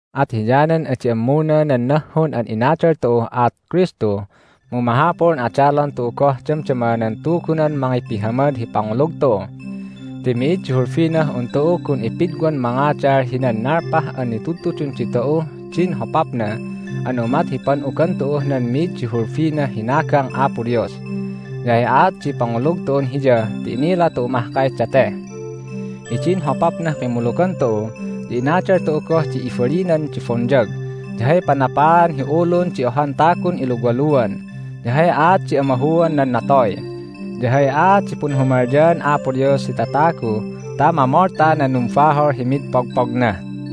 At hiyanan adi ammuna nan nahhun an inadal tu'uh aat Kristu mu mahapul an adalon tu'u goh damdama nan Tugunan mangipihamad hi pangulug tu'u. Ti mi'id di hulbinah un tu'u gun ipidwan mangadal hinan nalpah an nitudtudun ditu'uh din hopapna an umat hi pan'ugan tu'uh nan mi'id di hulbinah hinagang Apo Dios, ya hay aat di pangulug tu'un Hiya ti inila tu'u mahkay date. Hidin hopapnah kimmulugan tu'u ya inadal tu'u goh di ibalinan di bonyag, ya hay panapaan hi ulun di ohan tagun iluwaluan, ya hay aat di amahuan nan natoy, ya hay aat di punhumalyaan Apo Dios hi tatagu ta mamolta nan numbahol hi mid pogpogna.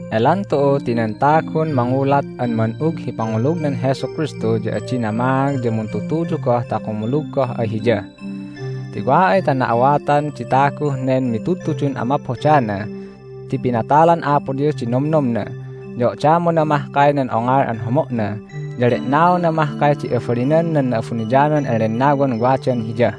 Elan tu'u ti nan tagun mangulat an man'ug hi pangulugnan Jesu Kristu ya adi namaag ya muntutuyu goh ta kumulug goh ay Hiya. Ti wa ay ta na'awatan di taguh nen mitudtudun amaphodana ti pinatalan Apo Dios di nomnomna, ya odamona mahkay nan ongol an homo'na, ya le'naona mahkay di abalinan nan Na'abuniyanan an Lennawan wadan hiya,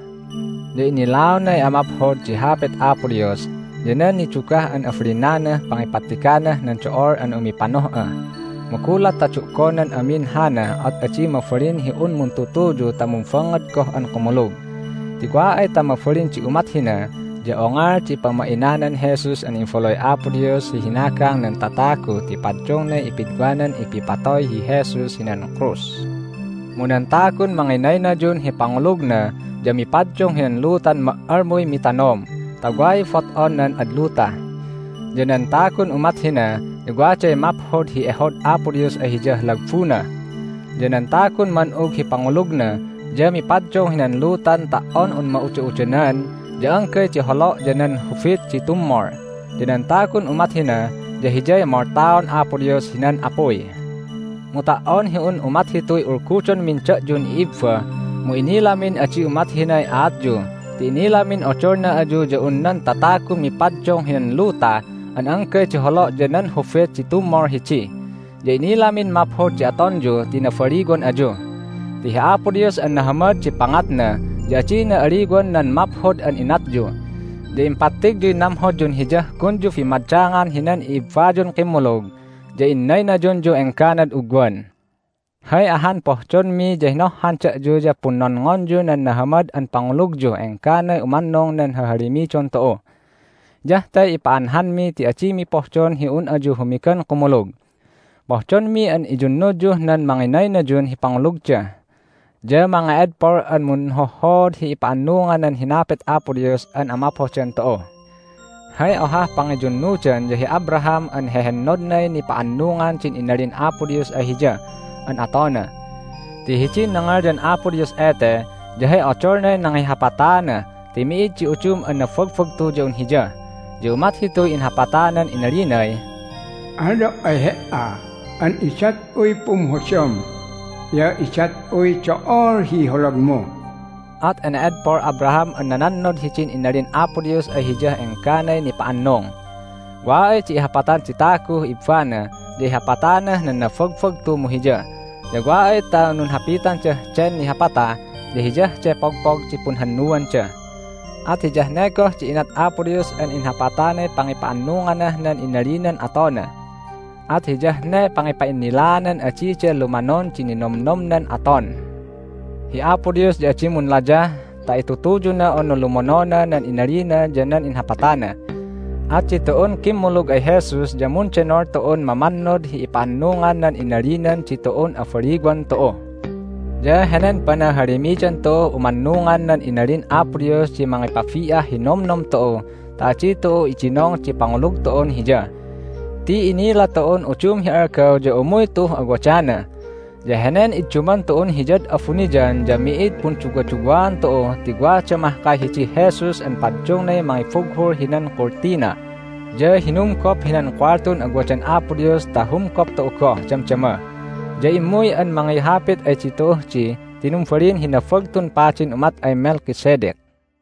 ya innilaonay amaphod di Hapit Apo Dios, ya nan nidugah an abalinanah pangipattiganah nan do'ol an umipanoh'a, mu gulat ta du'gonan amin hana at adi mabalin hi un muntutuyu ta mumbangngad goh an kumulug. Ti wa ay ta mabalin di umat hina ya ongol di pamainanan Jesus an Imbaluy Apo Dios hi hinagang nan tatagu ti paddungnay ipidwanan ipipatoy hi Jesus hinan krus. Mu nan tagun manginaynayun hi pangulugna ya mipaddung hinan lutan ma"almuy mitanom ta way bot'on nan ad luta. Ya nan tagun umat hina ya waday maphod hi ehod Apo Dios ay hiyah lagbuna. Ya nan tagun man'ug hi pangulugna ya mipaddung hinan lutan ta"on un ma'uda'udanan ya anggay di holo' ya nan hubit di tummol. Ya nan tagun umat hina ya hiyay moltaon Apo Dios hinan apuy. Mu ta"on hi un umat hituy ulgudonmin da'yun i'ibba mu inilamin adi umat hinay aatyu ti inilamin odolna ayu ya un nan tatagun mipaddung hinan luta an anggay di holo' ya nan hubit di tummol hidi, ya inilamin maphod di atonyu ti nabaliwan ayu. Ti hi Apo Dios an nahamad di pangatna ya adina aliwan nan maphod an inatyu, ya impattigyuy namhodyun Hiyah gunyu bimmadangan hinan i'ibbayun kimmulug, ya innaynayunyuh engganad ugwan. Hay ahan pohdonmi ya hinohhan dayu ya punnonngonyu nan nahamad an pangulugyuh engganay umannung nan hahalimidon tu'u. Hiyah te ipa'anhanmi ti adimi pohdon hi un ayu humigan kumulug. Pohdonmi an iyunnudyuh nan manginaynayun hi pangulugda, ya mange'edpol an munhohhood hi ipa'annungan nan hinapit Apo Dios an amaphodan tu'u. Hay ohah pangiyunnudan ya hi Abraham an hehennodnay nipa'annungan din inalin Apo Dios ay hiya an atona. Ti hidin nangalyan Apo Dios ete ya hay odolnay nangihapataana ti mi'id di udum an nabagbagtu ya un Hiya. Ya umat hituy inhapatanan inalinay, "Alyo' ay he"a an idat'uy pumhodam, ya idat'uy do'ol hi holagmu." At ene'edpol Abraham an nanannod hidin inalin Apo Dios ay hiyah engganay nipa'annung. Wa ay di ihapatan di taguh ibbana ya ihapatanah nan nabagbagtu mu hiya. Ya wa ay ta nunhapitandah den nihapata ya hiyah de pogpog di punhannuanda. At hiyah ne goh di inat Apo Dios an inhapatanay pangipa'annunganah nan inalinan atona. At hiyah ne pangipa'innilaanan adida lumanon di ninomnomnan aton. Hi Apo Dios ya adi munlayah ta itutuyuna unu lumonona nan inalina ya nan inhapatana. At ditu'un kimmulug ay Jesus ya mundenol tu'un mamannod hi ipa'annungan nan inalinan ditu'un abaliwan tu'u. Ya henen panahalimidan tu'uh umannungan nan inalin Apo Dios di mangipabi'ah hi nomnom tu'u ta adi tu'u idinong di pangulug tu'un Hiya. Ti inila tu'un udum hi algaw ya umuy tu'uh awadana. Ya henen idduman tu'un Hiyad abuniyan ya mi'id punduwaduwaan tu'u ti wada mahkay hidih Jesus an paddungnay mangibughul hinan kultina, ya hinumgop hinan kuwaltun awadan Apo Dios ta humgop tu'u goh damdama. Ya immuy an mangihapit ay ditu'uh di ti numbalin hi Nabagtun Padin umat ay Melchizedek.